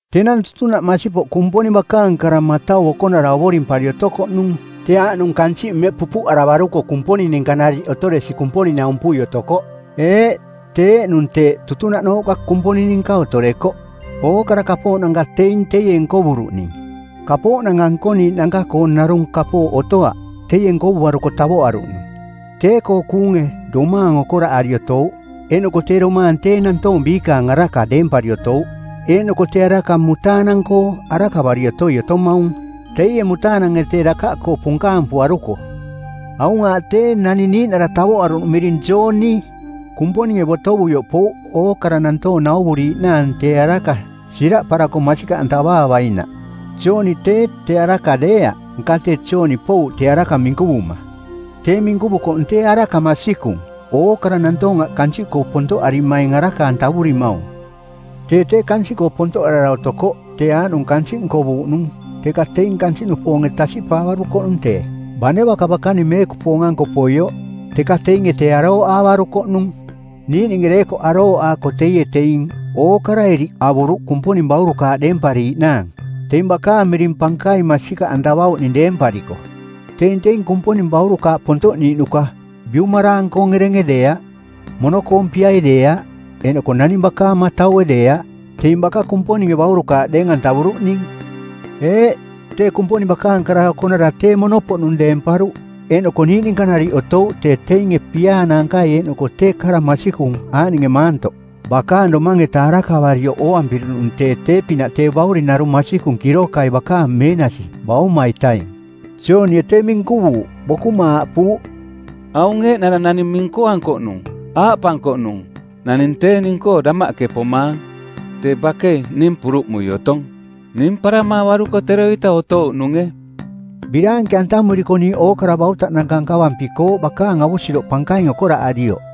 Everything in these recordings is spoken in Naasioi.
Tenang tutunaꞌ masipoꞌ Kumponing bakaang Kara˜ Matau Okonara ovorimpari otokoꞌnung. Tee aaꞌnung kansiꞌ mmeꞌ pupuꞌaravaruko Kumponing ninka nariꞌ otoresi Kumponing-naumpui otokoꞌ. Eeꞌ, tee eeꞌnung teeꞌ tutunaꞌnooꞌka Kumponing ninka otorekoꞌ. Ookara kapooꞌnanka teing teie nkovuruꞌning. Kapooꞌnanka nkoniiꞌnanka-koo narung kapooꞌ otoaꞌ teie nkovuaruko tavoꞌaruꞌnung. Tee-koo kuunge domaang okoraꞌari otouꞌ, eeꞌnoko tee domaang tee nantoong biikaang araka deempari otouꞌ. Eeꞌnoko tee araka mutaanang-koo arakavari otoi otomaung, teie mutaanange tee dakaꞌkoo punkaampuaruko˜. Aung aaꞌ tee, naning niiꞌnara tavoꞌaruꞌnung miring Jooni. Kumponinge botovuioꞌ pouꞌ ookara nantoong nauvuriiꞌnaang tee araka, siraꞌparako masikaꞌantavaavainaꞌ. Jooni tee, tee araka deeaꞌ, nka tee Jooni pouꞌ tee araka minkuvuma. Tee minkuvukoꞌnung tee araka masikung, ookara nantoong aꞌ kansiꞌkoo pontoꞌarimaing araka-antavurimaung. Tee tee kansiꞌkoo pontoꞌarara otokoꞌ, tee aaꞌnung kansiꞌ nkovuuꞌnung, teka teing kansiꞌnupoonge tasiꞌpaavarukoꞌnung tee. Bane baka bakaning meekupoong-anko poioꞌ, teka teinge tee arooꞌaavarukoꞌnung. Niiꞌninge deekoꞌ arooꞌaako teie teing ookara iriꞌ avuruꞌ Kumponing baurukaaꞌ deempariiꞌnaang, teing bakaang miring pankaing masikaꞌantavauꞌning deempariko. Teing teing Kumponing baurukaaꞌ pontoꞌniiꞌnuka; biumaraang-koong erenge deeaꞌ, mono-koong piai deeaꞌ, eeꞌnoko naning bakaang mataue deeaꞌ; teing baka Kumponinge baurukaaꞌ deeng-antavuruꞌning. Eeꞌ, tee Kumponing bakaang Kara Okonara tee mono-poꞌnung deemparuꞌ eeꞌnoko niiꞌ ninka nariꞌ otouꞌ tee teinge piaa naankai eeꞌnoko tee kara masikung aaꞌninge maantoꞌ. Bakaang domaang-eta arakavarioꞌ ooampiruꞌnung tee tee-pinaꞌ tee Bauring narung masikung kirokai bakaang meenasi Bauma-itaing. Joonie tee minkuvuuꞌ; bokuma aaꞌpuuꞌ, “Aung eeꞌnara naning minkuankoꞌnung, aaꞌpankoꞌnung: Naning tee ning-koo damaꞌke pomaang tee bakei ning puruꞌmui otong. Ning paramaavaruko teroita otouꞌnunge.” Biraanke-antamuriko niiꞌ ookara bautaꞌnanka nkavampikooꞌ bakaang avusiroꞌ pankaing okoraꞌarioꞌ.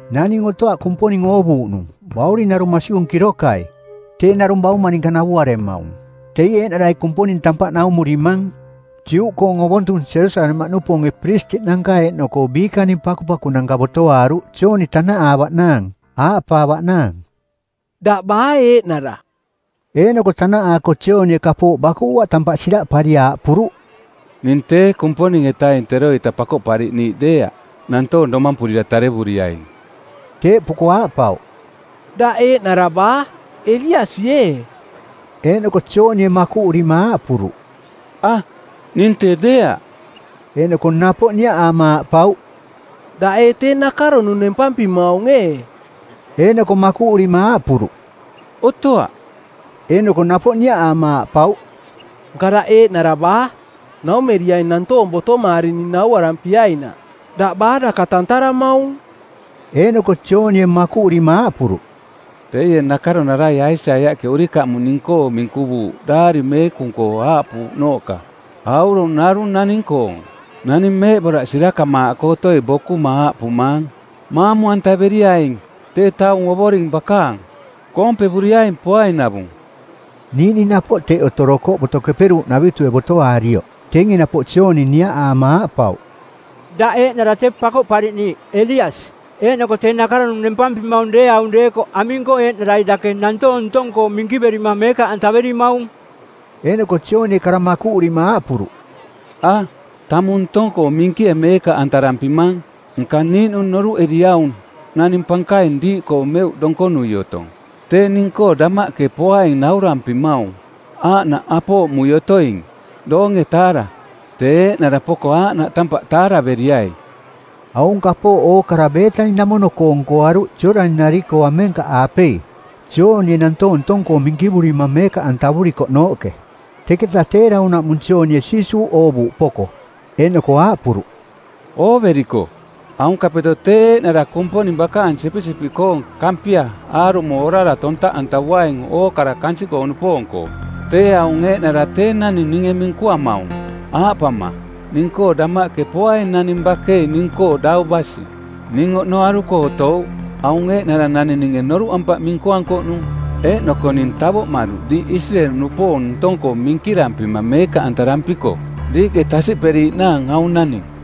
Naning otoaꞌ Kumponing oovuuꞌnung. Bauring narung masikung kirokai, tee narung bauma ninka navuaremaung. Teie eeꞌnarai Kumponing tampaꞌ naumurimang. Juꞌkoong ovontung Jerusalemaꞌnupoonge piristiꞌnanka eeꞌnoko biikaning pakupakunanka botoaaruꞌ Jooni tanaꞌaavaꞌnaang, aaꞌpaavaꞌnaang, “Daꞌ baa eeꞌnara?” Eeꞌnoko tanaꞌaako Joonie kapooꞌ bakuꞌuaꞌ tampaꞌ siraꞌpari aaꞌpuruꞌ: “Ning tee Kumponing-etaing teroita Pakoꞌpariꞌniiꞌ˜ deeaꞌ, nantoong domampurira tarevuriaing.” Teeꞌpuko aaꞌpauꞌ, “Daꞌ eeꞌnara baa, Eliasi ee?” Eeꞌnoko Joonie makuꞌurima aaꞌpuruꞌ, “A, ning tee deeaꞌ.” Eeꞌnoko napoꞌ niaꞌaama aaꞌpauꞌ, “Daꞌ ee tee nakaronung nempampimaung ee?” Eeꞌnoko makuꞌurima aaꞌpuruꞌ, “Otoaꞌ.” Eeꞌnoko napoꞌ niaꞌaama aaꞌpauꞌ, “Nka daꞌ eeꞌnara baa? Naumeriaing nantoong botomaarining nauarampiainaꞌ. Daꞌ baa daka tantaramaung?” Eeꞌnoko Joonie makuꞌurima aaꞌpuruꞌ, “Teie nakaronarai Aisaiaꞌke urikamuꞌ ning-koo minkuvuuꞌ Daari Meekung-koo aaꞌpuuꞌnooꞌka, ‘Aurong narung naning-koong, naning meeꞌboraꞌ sirakamaaꞌ otoi bokuma aaꞌpumaang, maamu-antaveriaing tee taung Ovoring bakaang. Koompevuriaing poainavung.’” Niiꞌning napoꞌ teꞌ otorokoꞌ Boto Keperuuꞌnavitue˜ botoaarioꞌ. Teinge napoꞌ Jooni niaꞌaama aaꞌpauꞌ, “Daꞌ eeꞌnara Tee Pakoꞌpariꞌniiꞌ, Eliasi, eeꞌnoko tee nakaronung nempampimaung deeaung deekoꞌ aming-koo eeꞌnarai dake nantoong ntong-koo minkiverima meekaꞌantaverimaung?” Eeꞌnoko Joonie kara makuꞌurima aaꞌpuruꞌ, “A, tamung ntong-koo minkie meekaꞌ antavarampimang. Nka niiꞌnung noruꞌeriaung naning pankaing diiꞌkoo meuꞌ donkonui otong. Tee ning-koo damaꞌke poaing naurampimaung aaꞌnaꞌ apooꞌmui otoing, doonge-taara˜. Tee eeꞌnara poko aaꞌnaꞌ tampaꞌ taaraveriai!” Aung kapooꞌ ookara Beetani-namono-koo nkoaruꞌ Jooꞌdani-nari-koo amenkaꞌaapei, Joonie nantoong ntong-koo minkivurima meekaꞌantavurikoꞌnooꞌke. Teketa tee daunaꞌmung Joonie Jiisuuꞌ oovuuꞌ poko, eeꞌnoko aaꞌpuruꞌ, “Ooveriko, aunkapeto tee eeꞌnara Kumponing Bakaang Sipisipiꞌkoong Kampia aarumo orara tontaꞌuaing ookara kansiꞌnupoong-koo. Tee aung eeꞌnara tee naning ninge minkuamaung, aaꞌpama, ning-koo damaꞌke poaing naning bakei ning-koo dau basi. Ning oꞌnoaruko otouꞌ. Aung eeꞌnara naning ninge noruꞌampaꞌ minkuankoꞌnung, eeꞌnoko ning tavoꞌmaruꞌ diiꞌ Isireeli-nupoong ntong-koo minkirampima meekaꞌantarampiko, diiꞌke tasiꞌperiiꞌnaang aung naning.”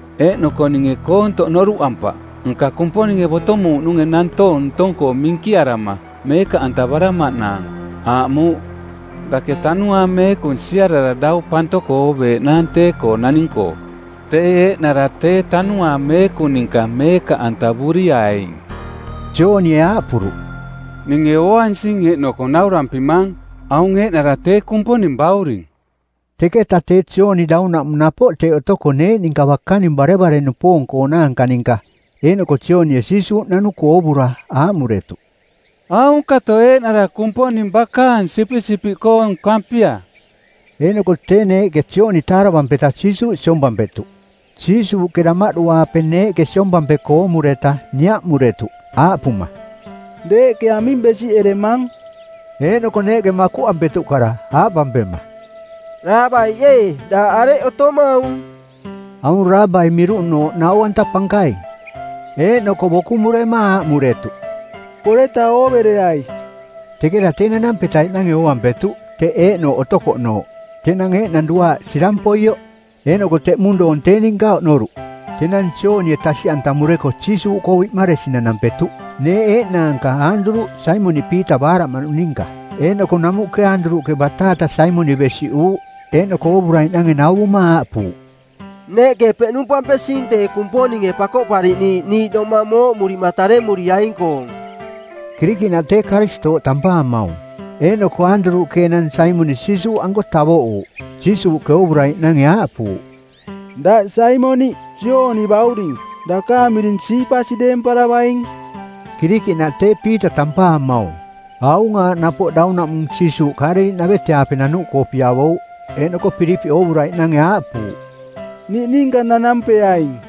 Eeꞌnoko ninge koontoꞌ noruꞌampaꞌ, nka Kumponinge, botomuuꞌnunge nantoong ntong-koo minkiarama meekaꞌantavaramaꞌnaang, aaꞌmuuꞌ, ‘Dake Tanuaang Meekung siarara dau pantoko ooveeꞌnaang tee-koo naning-koo. Tee eeꞌnara tee Tanuaang Meekung ninka meekaꞌantavuriaing.’” Joonie aaꞌpuruꞌ, “Ninge ooansing, eeꞌnoko naurampimang, aung eeꞌnara tee Kumponing Bauring.” Teketa tee Jooni daunaꞌmung napoꞌ teꞌ otoko neeꞌ ninka bakaning barevare-nupoong-koonaanka ninka. Eeꞌnoko Joonie Jiisuuꞌ nanuko oovura aaꞌmuretuꞌ, “Aunkato eeꞌnara Kumponing Bakaang Sipisipiꞌkoong Kampia.” Eeꞌnoko tee neeꞌke Jooni taaravampeta Jiisuuꞌ siompampetuꞌ. Jiisuuꞌke damaꞌdu-aape neeꞌke siompampeko oomureta niaꞌmuretuꞌ aaꞌpuma, “Deeꞌke aming besiꞌeremang?” Eeꞌnoko neeꞌke makuꞌampetuꞌ kara, aaꞌpampema, “Raabaiꞌ ee, daꞌ areꞌ otomaung?” (Aung Raabaiꞌ miruꞌnooꞌ Nau-anta Pankaing.) Eeꞌnoko bokumurema aaꞌmuretuꞌ, “Poreta oovereai.” Teketa tee nanampetaiꞌnange ooampetuꞌ teꞌ eeꞌnooꞌ otokoꞌnooꞌ. Tenang eeꞌnang duaaꞌ sirang poioꞌ. Eeꞌnoko teꞌmung doong tee ninka oꞌnoruꞌ. Tenang Joonie tasiꞌantamureko Jiisuuꞌkoo biꞌmaresi nanampetuꞌ. Neeꞌ eeꞌnaanka Aanduruꞌ, Saimoniꞌ Piita baaraꞌmaꞌnung ninka. Eeꞌnoko namuꞌke Aanduruꞌke bataata Saimoniꞌ besiꞌuuꞌ. Eeꞌnoko oovuraiꞌnange nauvuma aaꞌpuuꞌ, “Neeꞌke peꞌnumpampesing tee Kumponinge Pakoꞌpariꞌniiꞌ niiꞌ domang mooꞌmurima taremuriaing-koong” (Kirikiꞌnaꞌ tee Karistooꞌ tampaamaung). Eeꞌnoko Aanduruꞌke enang Saimoniꞌ Jiisuuꞌanko tavoꞌuuꞌ. Jiisuuꞌke oovuraiꞌnange aaꞌpuuꞌ, “Daꞌ Saimoniꞌ, Jooni bauring. Dakaang miring Siipasi deemparavaing,” Kirikiꞌnaꞌ tee Piita tampaamaung. Aung aaꞌ napoꞌ daunaꞌmung Jiisuuꞌ Kaaleliꞌnavete-aape nanuꞌkoo piavouꞌ. Eeꞌnoko Pilipiꞌ oovuraiꞌnange aaꞌpuuꞌ, “Niꞌninka nanampeaing.”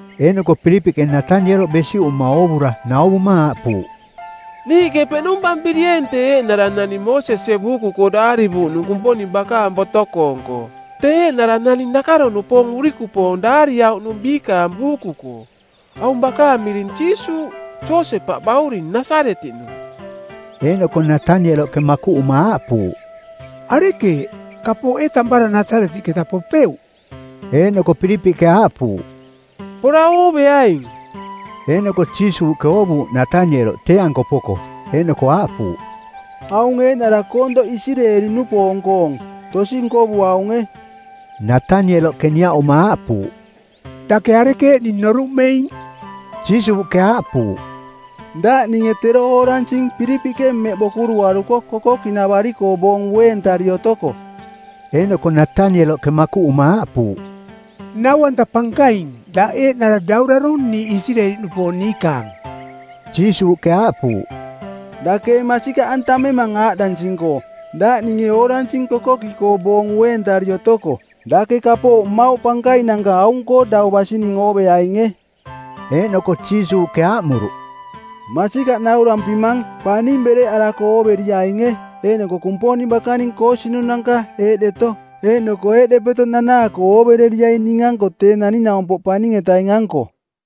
Eeꞌnoko Pilipiꞌke Natanieloꞌ besiꞌuma oovura nauvuma aaꞌpuuꞌ, “Niiꞌke peꞌnumpampirieeng tee eeꞌnara naning Moosesie buuku-koo daarivuuꞌnung Kumponing bakaang boto-koong-koo, tee eeꞌnara naning nakaro-nupoong urikupoong daariauꞌnung biikaang buuku-koo. Aung bakaang miring Jiisuuꞌ, Josepaꞌ bauring, Nasaretiꞌnung.” Eeꞌnoko Natanieloꞌke makuꞌuma aaꞌpuuꞌ, “Arekeeꞌ? Kapooꞌ ee tampara Nasaretiꞌketa popeuꞌ?” Eeꞌnoko Pilipiꞌke aaꞌpuuꞌ, “Pora ooveaing.” Eeꞌnoko Jiisuuꞌke oovuuꞌ Natanieloꞌ tee-anko poko, eeꞌnoko aaꞌpuuꞌ, “Aung eeꞌnara koontoꞌ Isireeli-nupoong-koong. Tosi nkovuaunge.” Natanieloꞌke niaꞌuma aaꞌpuuꞌ, “Dake arekeeꞌ ning noruꞌmeing?” Jiisuuꞌke aaꞌpuuꞌ, “Daꞌ ninge tero ooransing Pilipiꞌke mmeꞌ bokuruaruko kokoki-navari-koo boong ueentari otoko.” Eeꞌnoko Natanieloꞌke makuꞌuma aaꞌpuuꞌ, “Nau-anta Pankaing, daꞌ eeꞌnara Daurarong˜ niiꞌ Isireeli-nupoong niikaang.” Jiisuuꞌke aaꞌpuuꞌ, “Dake ee masikaꞌantamemang aaꞌdansing-koo, ‘Daꞌ ninge ooransing kokoki-koo boong ueentari otoko.’? Dake kapooꞌ mmauꞌ pankainanka aung-koo dau basining ooveainge.” Eeꞌnoko Jiisuuꞌke aaꞌmuruꞌ, “Masikaꞌ naurampimang, paning bereꞌarako ooveriainge, eeꞌnoko Kumponing bakaning koosinunanka eeꞌdeto eeꞌnoko eeꞌdepeto nanaako oovereriaing ning-anko Tee Naning-naumpoꞌ Paning-etaing-anko.”